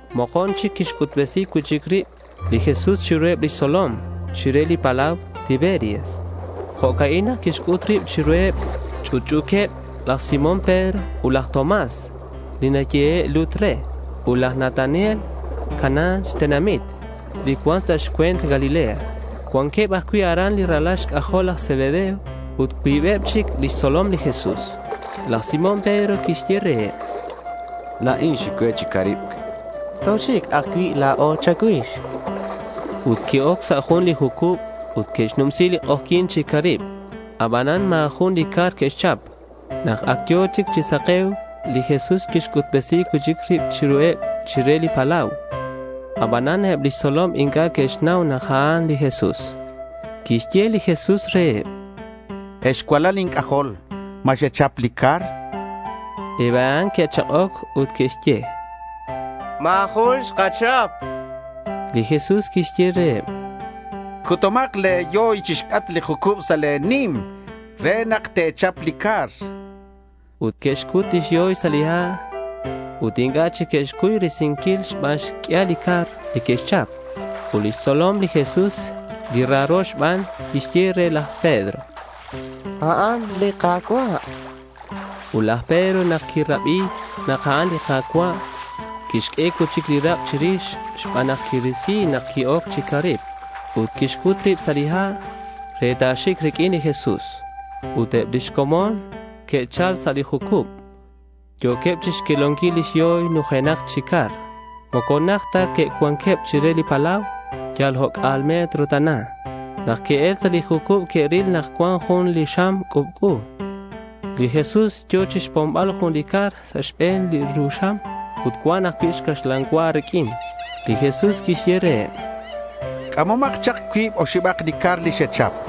Mokon chic quixc'utbesi cui'chic rib li Jesús chiruheb lix tzolom chire li palau Tiberias. Jo'ca'in nak quixc'ut rib chiruheb: Ch'utch'u̱queb laj Simón Pedro ut laj Tomás li nayehe' lut re, ut laj Natanael, Caná xtenamit li cuan sa' xcue̱nt Galilea. Cuanqueb ajcui' aran li ralal laj Zebedeo ut cuibeb chic lix tzolom li Jesús. Laj Simón Pedro quixye reheb: —La̱in xic cue chi caribc, chan. —Toxic ajcui' la̱o cha̱cuix, chanqueb re. Ut que'oc sa' jun li jucub ut que'xnumsi li k'ojyi̱n chi caribc. Abanan ma̱ jun li car que'xchap. Nak ac yo̱ chic chi sake̱uc, li Jesús quixc'utbesi cui'chic rib chiruheb chire li palau. Abanan eb lix tzolom inc'a' que'xnau nak a'an li Jesús. Quixye li Jesús reheb: —Ex cualal inc'ajol, ¿ma xechap li car? chan. Eb a'an que'chak'oc ut que'xye: —Ma̱ jun xkachap.— Li Jesús quixye reheb: —Cutumak le̱ yoy chixc'atk li jucub, sa' le̱ nim re nak te̱chap li car, chan. Ut que'xcut lix yoy sa' li ha' ut inc'a' chic que'xcuy risinquil xban xq'uial li car li que'xchap. Ut lix tzolom li Jesús, li raro xban, quixye re laj Pedro: —¡A'an li Ka̱cua'!— Ut laj Pedro, nak quirabi nak a'an li Ka̱cua', quixq'ue cui'chic li rak' chirix xban nak quirisi nak qui-oc chi caribc, ut quixcut rib sa' li ha' re ta̱xic riq'uin li Jesús. Ut eb lix comon que'chal sa' li jucub. Yo̱queb chixquelonquil lix yoy nujenak chi car. Moco najt ta cuanqueb chire li palau, yal oc'a̱l metro tana. Nak que'el sa' li jucub que'ril nak cuan jun li xam c'ubc'u. Li Jesús yo̱ chixpombal jun li car sa' xbe̱n li ru xam ut cuan ajcui' caxlan cua riq'uin. Li Jesús quixye reheb: —C'amomak chak cuib oxibak li car li xechap.—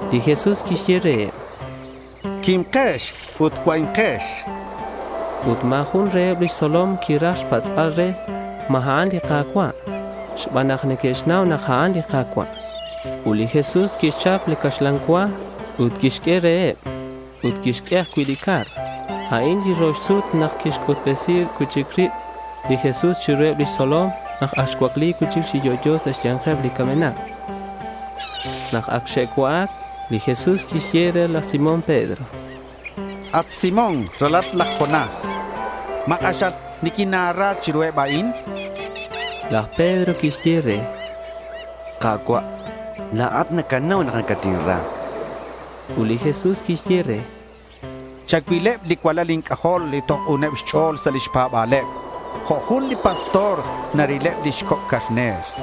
Li Jesús quixye reheb: —Quimkex ut cua'inkex.— Ut ma̱ jun reheb lix tzolom quiraj xpatz'bal re ma a'an li Ka̱cua' xban nak ac neque'xnau nak a'an li Ka̱cua'. Ut li Jesús quixchap li caxlan cua ut quixq'ue reheb. Ut quixq'ue ajcui' li car. A'in li rox sut nak quixc'utbesi cui'chic rib li Jesús chiruheb lix tzolom nak ac xcuacli cui'chic chi yo'yo sa' xya̱nkeb li camenak. Nak ac xe'cua'ac, li Jesús quixye re laj Simón Pedro: —At Simón, ralalat laj Jonás, ¿ma k'axal niquina̱ra chiruheb a'in?— Laj Pedro quixye re: —Ka̱cua', la̱at nacanau nak nacatinra, chan. Ut li Jesús quixye re: —Chacuilakeb li cualal inc'ajol li toj k'uneb xch'o̱l sa' lix pa̱ba̱leb jo' jun li pastor narileb lix coc' carner.—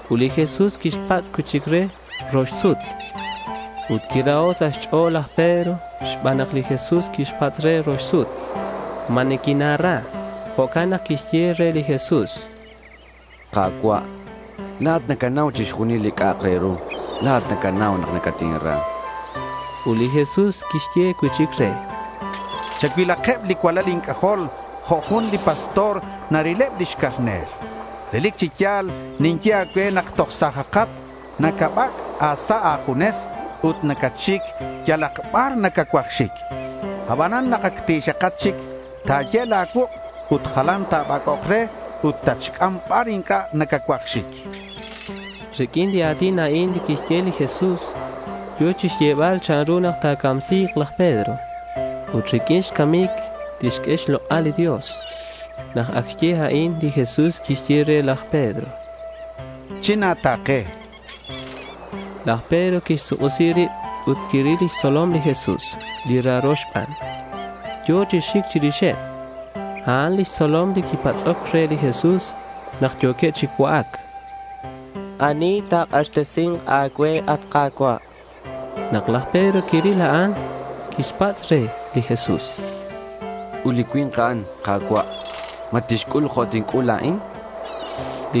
Ut li Jesús quixpatz' cui'chic re rox sut: —At Simón, ralalat laj Jonás, ¿ma niquina̱ra?— Ut quiraho' sa' xch'o̱l laj Pedro xban nak li Jesús quixpatz' re rox sut “¿ma niquina̱ra?”. Jo'can nak quixye re li Jesús: —Ka̱cua', la̱at nacanau chixjunil li c'a'ak re ru. ¡La̱at nacanau nak nacatinra!— Ut li Jesús quixye cui'chic re: —Chacuilakeb li cualal inc'ajol jo' jun li pastor narileb lix carner. Relic chi ya̱l ninye a̱cue nak toj sa̱jat, nacabac' a̱sa' a̱junes ut nacatxic yalak bar nacacuaj xic. Abanan nak ac ti̱xakat chic, ta̱ye' la̱ cuuk' ut jalan ta̱bac'ok re ut tatxc'am bar inc'a' nacacuaj xic, chan. Riq'uin li a̱tin a'in li quixye li Jesús, yo̱ chixyebal chanru nak ta̱camsi̱k laj Pedro. Ut riq'uin xcamic tixq'ue xlok'al li Dios. Nak ac xye a'in, li Jesús quixye re laj Pedro: —China̱ta̱ke, chan re. Laj Pedro quixsuk'isi rib ut quiril lix tzolom li Jesús, li raro xban, yo̱ chi xic chirixeb. A'an lix tzolom li quipatz'oc re li Jesús nak yo̱queb chi cua'ac, “¿Ani ta̱k'axtesi̱nk a̱cue, at Ka̱cua'?” Nak laj Pedro quiril a'an, quixpatz' re li Jesús: —Ut li cui̱nk a'an, Ka̱cua', ¿ma tixc'ul jo' tinc'ul la̱in? chan.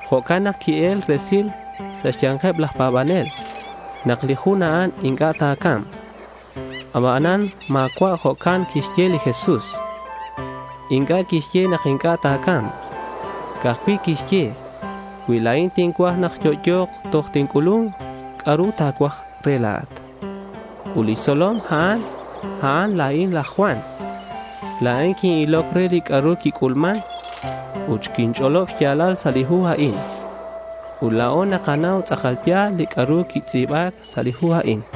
Jo'can nak qui-el resil sa' xya̱nkeb laj pa̱banel nak li jun a'an inc'a' ta̱ca̱mk. Abanan ma̱cua' jo'can quixye li Jesús. Inc'a' quixye nak inc'a' ta̱ca̱mk. Ca'aj cui' quixye, “Cui la̱in tincuaj nak yo'yo̱k toj tinc'ulu̱nk, ¿c'a'ru ta̱cuaj re la̱at?” Ut li tzolom a'an, a'an la̱in laj Juan. La̱in quin-iloc re li c'a'ru quic'ulman ut xinch'olob xya̱lal sa' li hu a'in. Ut la̱o nakanau nak tz'akal ya̱l li c'a'ru xintz'i̱ba sa' li hu a'in.